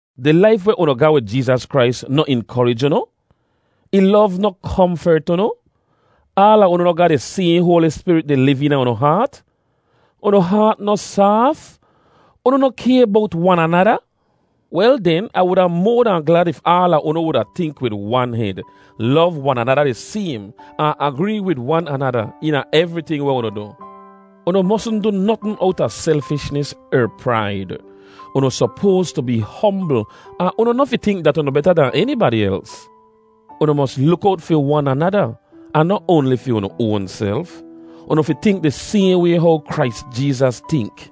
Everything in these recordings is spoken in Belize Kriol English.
Di laif weh unu ga wid Jeezas Krais noh inkorij unu? Ih lov noh komfert unu? Aala unu noh ga di sayhn Hoali Spirit di liv eena unu haat? Unu haat noh saaf? Unu noh kay bowt wan anada? Wel den, Ah wuda moa dahn glad if aala unu wuda tink wid wan hed, lov wan anada di saym, ahn agree wid wan anada eena evriting weh unu du. Unu mosn du notn owta selfishnis er praid. Unu sopoas tu bee hombl ahn unu noh fi tink dat unu beta dahn enibadi els. Unu mos luk owt fi wan anada, ahn noh oanli fi unu oanself. Unu fi tink di sayhn way how Krais Jeezas tink: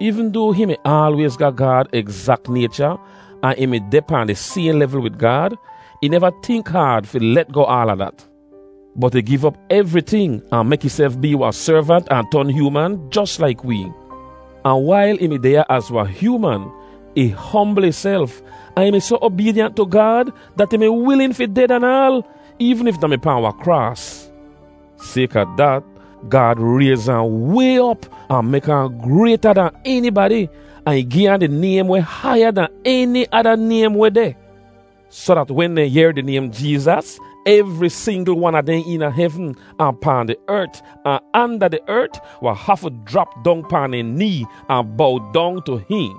Eevn doa hihn mi aalwayz ga Gaad egzak naycha, ahn ih mi deh pahn di sayhn levl wid Gaad, ih neva tink haad fi let goh aala dat. Bot ih giv op evriting ahn mek ihself bee wahn servant ahn ton hyooman jos laik wee. Ahn wail ih mi deh ya az wahn hyooman, ih hombl ihself, ahn ih mi soh obeedyant tu Gaad dat ih mi wilin fi ded anaal, eevn if da mi pahn wahn kraas! Sayka dat, Gaad rayz ahn way op ahn mek ahn grayta dahn enibadi, ahn ih gi ahn di naym weh haiya dahn eni ada naym weh deh. Soh dat wen dehn yehr di naym “Jeezas,” evri singl wan a dehn eena hevn, ahn pahn di ert, ahn anda di ert, wahn hafu jrap dong pahn dehn nee ahn bow dong tu hihn.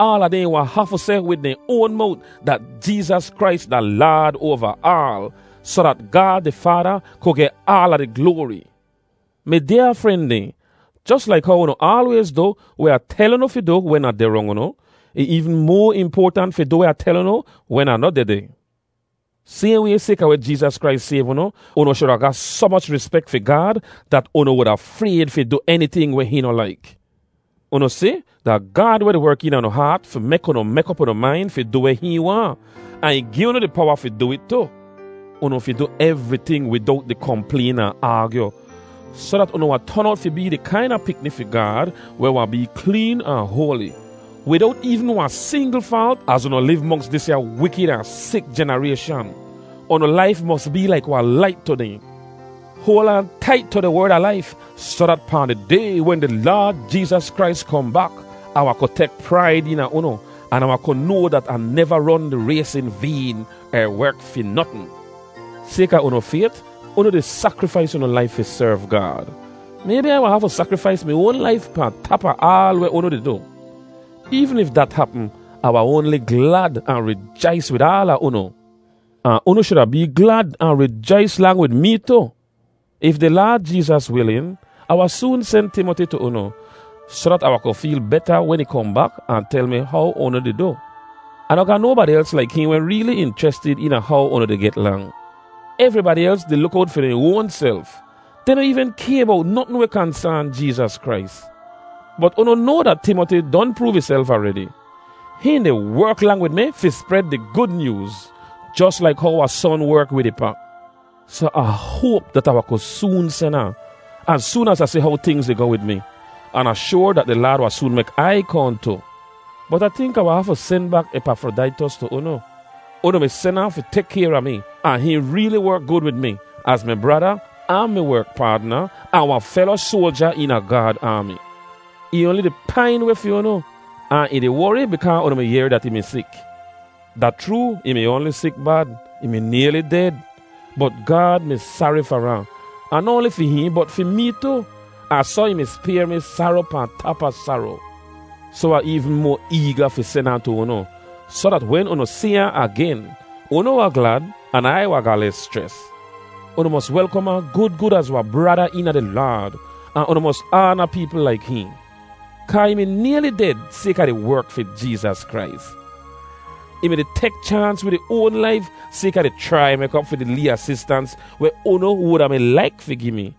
Aala dehn wahn hafu seh wid dehn oan mowt dat Jeezas Krais da Laad oava aal, soh dat Gaad di Faada ku geh aala di gloari. Mi dyaa fren dehn, jos laik how unu aalwayz du weh Ah tel unu fi du wen Ah deh rong unu, ih eevn moa impoatant fi du weh Ah tel unu wen Ah noh dehdeh. Sayhn way, sayka weh Jeezas Krais sayv unu, unu shuda ga soh moch rispek fi Gaad dat unu wuda frayd fi du eniting weh hihn noh laik. Unu si, da Gaad weh di werk eena unu haat fi mek unu mek op unu main fi du weh hihn waahn, ahn ih gi unu di powa fi du it tu. Unu fi du evriting widowt di komplayn ahn aagyu, soh dat unu wahn ton owt fi bee di kaina pikni fi Gaad weh wahn bee kleen ahn hoali, widowt eevn wahn singl faalt az unu liv monks disya wikid ahn sik jenarayshan. Unu laif mos bee laik wahn lait tu dehn. Hoal aan tait tu di Werd a Laif soh dat pahn di Day wen di Laad Jeezas Krais kohn bak, Ah wahn ku tek praid eena unu an Ah wahn ku noa dat Ah neva ron di rays in vayn er werk fi notn. Sayka unu fayt, unu di sakrifais unu laif fi serv Gaad. Maybi Ai wahn hafu sakrifais mi oan laif pahn tap a aal weh unu di du. Eevn if dat hapm, Ah wahn oanli glad ahn rijais wid aala unu. Ahn unu shuda bee glad ahn rijais lang wid mee tu. If di Laad Jeezas wilin, Ah wahn soon sen Timoti tu unu, soh dat Ah wahn ku feel beta wen ih kohn bak ahn tel mi how unu di du. Ah noh ga nobadi els laik hihn weh reeli inchrestid eena how unu di get lang. Evribadi els di luk owt fi dehn oanself! Dehn noh eevn kay bowt notn weh kansaan Jeezas Krais. Bot unu noa dat Timoti don proov ihself aredi. Hihn di werk lang wid mi fi spred di Gud Nyooz, jos laik how wahn son werk wid ih pa. Soh Ah hoap dat Ah wahn ku soon sen ahn, az soon az Ah si how tingz di goh wid mi. An Ah shoar dat di Laad wahn soon mek Ai kohn tu. Bot Ah tink Ah wahn hafu sen bak Epafrodaitos tu unu. Unu mi sen ahn fi tek kayr a mi, ahn hihn reeli werk gud wid mi, az mi brada, ahn mi werk paadna, ahn wahn felo soalja eena Gaad aami. Ih oanli di pain weh fi unu, ahn ih di wori bikaa unu mi yehr dat ih mi sik. Da chroo, ih mi oanli sik bad. Ih mi nayli ded. Bot Gaad mi sari far ahn; ahn noh oanli fi hihn, bot fi mee tu. Ahn soh ih mi spayr mi saro pahn tap a saro. Soh Ah eevn moa eega fi sen ahn tu unu, soh dat wen unu si ahn agen, unu wahn glad, an Ai wahn ga les schres. Unu mos welkom ahn gud gud az wahn brada eena di Laad, ahn unu mos aana peepl laik hihn, kaa ih mi nayli ded sayka di werk fi Jeezas Krais. Ih mi-di tek chaans wid ih oan laif sayka di chrai mek op fi di lee asistans weh unu wuda mi laik fi gi mi.